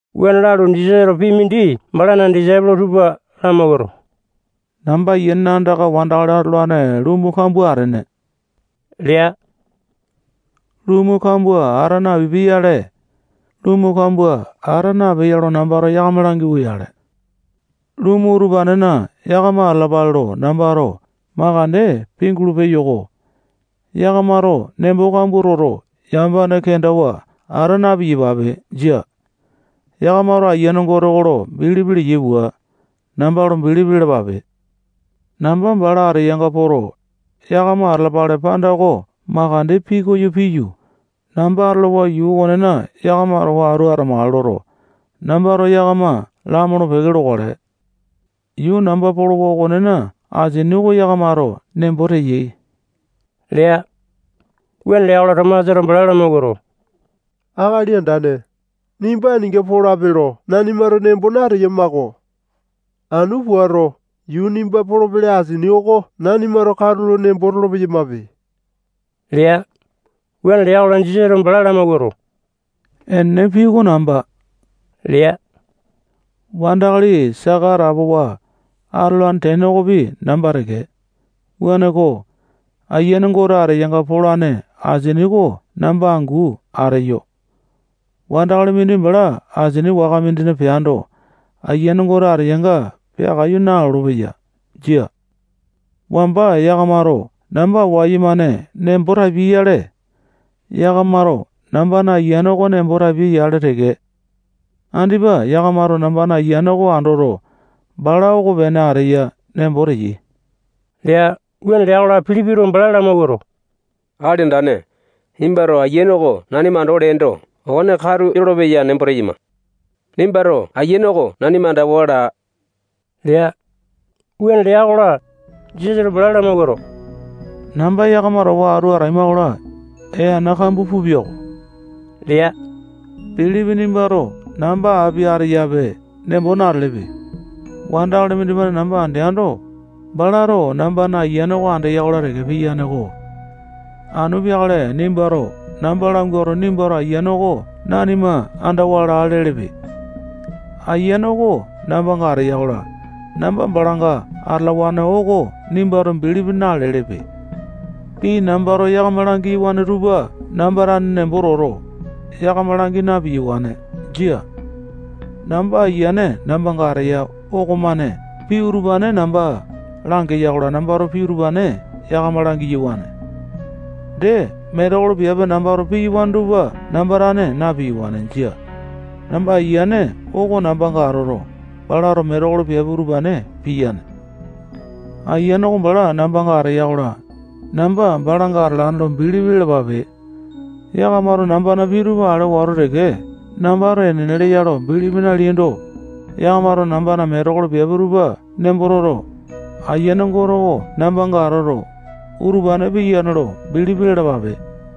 Wuane lalu, Jisasato pii mindi balana disaipolo tupa lamawuato, namba Ayianena andaka wandakali atolane lumu kambua atene lea. Lumu kambua ata napipia-yale, lumu kambua ata napeya lo nambato yakama langiwa-yale. Lumu utupanena yakama atalapale lo nambato makande pingulu peyo-ko. Yakamato nembo kambua toto, yamapane kendawa ata na-piyapape. Jia. Yakamato Ayiane Gote lo bilipi leyai pua, namba lo bilipi lalapape. Namba bala ateyanga poto, yakama atalapale panda oko makande pikoyo piyu, namba atolowa yuu okonena yakama towa atu atamakale loto, nambato yakama lamolo-peke lokale. Yuu namba polopeyawa okonena asini oko yakamato nembo teyai lea. Wuane lea-kola, Tomasato bala lamawuato, Akali Andane, nimba aninga polape lo nanimato nembo nateyama-ko. Anu puato, yuu nimba polopele asini oko nanimato katulo nembo tolo-peyamape lea. Wuane lea-kola, Jisasato bala lamawuato, enene pii oko namba lea. Wandakali saka atapowa atolane tene okopi namba teke. Wuaneko, Ayiane Gote ateyanga polane asini oko namba angu ateyo. Wandakali mindi bala asini waka mindina peando, Ayiane Gote ateyanga peakaiyu nalolo-peya. Jia. Wamba yakamato namba wayumane nembo tapiai-yale, yakamato nambana Ayiane oko nembo tapiai-yale teke. Andipa yakamato nambana Ayiane oko andoto, bala okopene ateya nembo teyai lea. Wuane lea-kola, Pilipito bala lamawuato, Akali Andane, nimbato Ayiane oko nanima andawa leendo, okone katu yolopeya nembo teyama-ko. Nimbato Ayiane oko nanima andawa laa lea. Wuane lea-kola, Jisasato bala lamawuato, namba yakama towa atu ataima-kola, ee ana kambua pupia-ko lea. Pilipi nimbato namba api ateyape nembo natelepe. Wandakali mindimane namba andeando, balato nambana Ayiane oko andeya-kola teke piyane-ko. Anu peakale nimbato namba languato, nimbato Ayiane oko nanima andawa laa lelepe. Ayiane oko nambanga ateya-kola, namba balanga atalawane oko nimbato bilipi nalelepe. Pii nambato yakama langiyawane tupa namba tane nembo toto, yakama langi na-piyawane. Jia. Namba Ayiane nambanga ateya okomane pii utupane namba langeya-kola, nambato pii utupane yakama langiyawane. Dee, metekolo piape nambato piyawane tupa namba tane na-piyawane. Jia. Namba Ayiane oko nambanga atoto, balana metekolo piape utupane piyane. Ayiane oko bala nambanga ateya-kola, namba balanga atalane lo bilipi lalapape. Yakamato nambana pii tupa ale wato teke, nambato enene leya lo bilipi naleaindo, yakamato nambana metekolo piape tupa nembo toto, Ayiane Gote oko nambanga atoto, utupane piyane lo bilipi lalapape.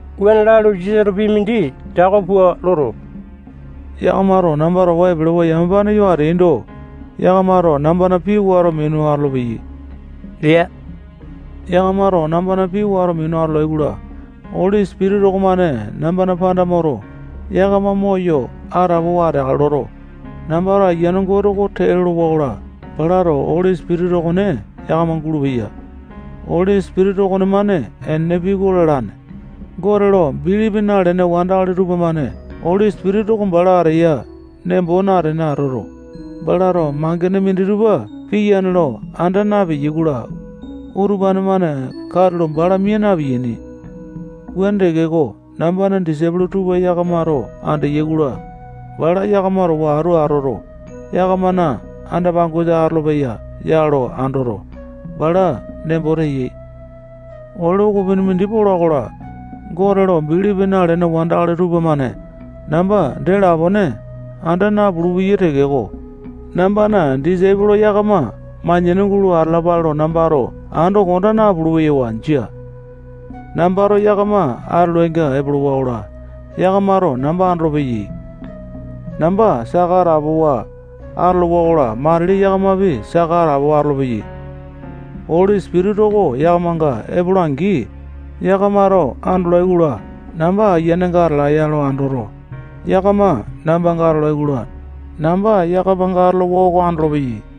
Wuane lalu, Jisasato pii mindi tako pua loto, yakamato namba towa epelewa yamapane yo ateaindo, yakamato nambana pii wato minu atolopeyai lea. Yakamato nambana pii wato minu atolai-kola, Oli Sipitisa okomane nambana panda moto, yakama moyo atapowa ateakale loto, nambato Ayiane Gote oko tee lolowa-kola, balato Oli Sipitisa okone yakama gulupeya. Oli Sipitisa okonemane enene pii oko lalane. Gote lo bilipi nalene wandakali tupamane Oli Sipitisa oko bala ateya nembo natene atoto, balato mangene minditupa piyane lo anda napeyai-kola, utupane-mane katulo bala mia na-piyiani. Wuane tekeko, nambana disaipolo tupa yakamato andeyai-kola, bala yakama towa atu atoto, yakamana anda-pangosa atolopeya ya lo andoto, bala nembo teyai. Ole ukupini mindi pola-kola, Gote lo bilipi nalene wandakali tupamane namba dee lapone anda napulu-peyai tekeko, nambana disaipolo yakama manyani gulo atalapale lo nambato ando konda napulu-peyawa. Jia. Nambato yakama atolainga epolowa-kola, yakamato namba andolopeyai. Namba saka atapowa atolowa-kola, matili yakamapi saka atapowa atolopeyai. Oli Sipitisa oko yakamanga epola-angi, yakamato andolai-kola, namba Ayianenga atalaeya lo andoto, yakama nambanga atolai-kola, namba yakamanga atolowa oko andolopeyai.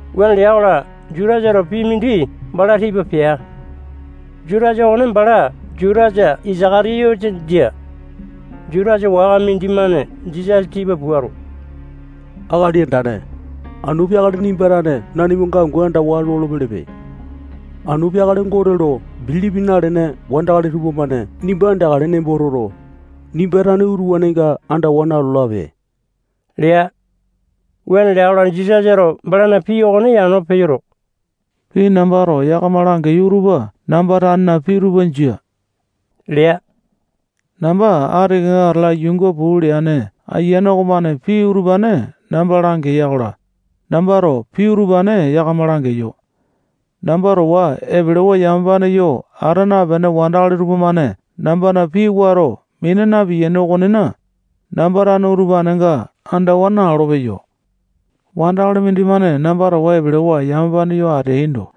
Wuane lea-kola, Jutasato pii mindi bala tipa pea. Jutasa okone bala Jutasa Isaka-tiyote jia. Jutasa waka mindimane Jisasa tipa puato, Akali Andane, anu peakale nimba tane nanimanga angu andawa lolo-pelepe. Anu peakale Gote lo bilipi nalene wandakali tupamane nimba andeakale nembo toto, nimba tane utupanenga andawa nalolape lea. Wuane lea-kola, Jisasato balana pii okone yano peyoto, pii nambato yakama langeyo utupa namba tanena pii tupa jia lea. Namba ati kenga atala yuunga puu leane Ayiane okomane pii utupane namba langeya-kola, nambato pii utupane yakama langeyo. Namba towa epelewa yamapane yo ata napene wandakali tupamane nambana pii wato mina na-piyaini okonena, namba tane utupanenga andawa nalolo-peyo. Wandakali mindimane namba towa epelewa yamapane yo ateaindo,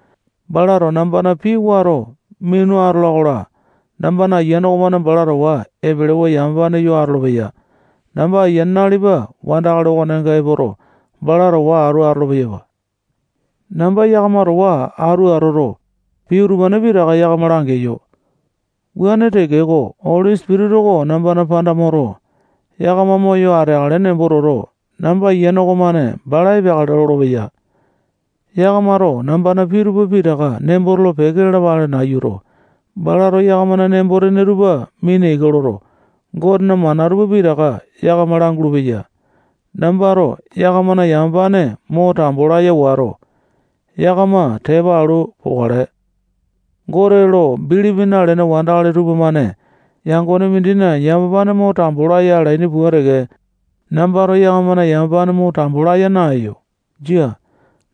balato nambana pii wato minu atola-kola, nambana Ayiane okomane bala towa epelewa yamapane yo atolopeya. Namba Ayiane nalipa wandakali okonenga epoto, bala towa atu atolo-peyapa. Namba yakama towa atu atoto, pii utupane pitaka yakama langeyo. Wuane tekeko, Oli Sipitisa oko nambana panda moto, yakama moyo ateakale nembo toto, namba Ayiane okomane bala epeakale lolopeya. Yakamato nambana pii tupa pitaka nembo tolo-peke lalapale nayuto, balato yakamana nembo-tene tupa mina ika loto, Gotena mana tupa pitaka yakama langulu-peya. Nambato yakamana yamapane mo tambo laya wato, yakama tepa alu pokale. Gote lo bilipi nalene wandakali tupamane yangone mindina yamapane mo tambo laya alaini pua teke, nambato yakamana yamapane mo tambo laya naeyo. Jia.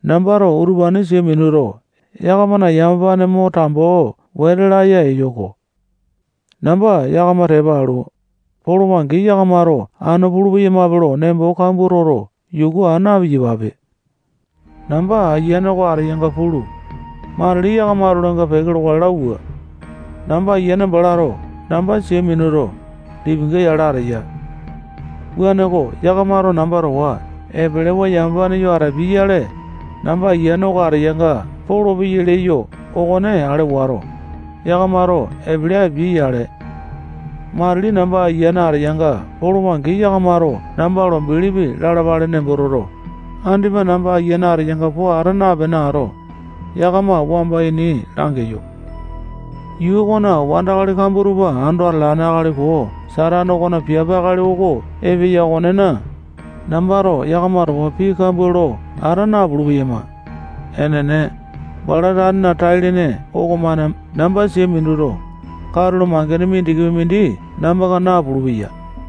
Nambato utupane sia minuto, yakamana yamapane mo tambo wete laya eyo-ko. Namba yakama tepa alu, polowa-angi, yakamato anu pulu-peyamape lo nembo kambua toto, yuku aa na-piyapape. Namba Ayiane oko ateyanga pulu, matili yakama atolainga peke lokale lauwa. Namba Ayiane balato namba sia minuto, lipinga yale ateya. Wuaneko, yakamato namba towa epelewa yamapane yo atapiai-yale, namba Ayiane oko ateyanga polopeyai leyo okone ale wato, yakamato epele apiai-yale. Matili namba Ayiane ateyanga polowa-angi, yakamato namba lo bilipi lalapale nembo toto, andipa namba Ayiane ateyanga po ata napene ato, yakama wamba ini langeyo. Yuu okona wandakali kambua tupa ando atalane akali koo Satane okona piape akali oko epeya okonena, nambato yakama towa pii kambua lo ata napulu-peyama. Enene, bala tanena tai-lene okomane namba sia minuto, katulo mangene mindikipi mindi nambanga napulu-peya.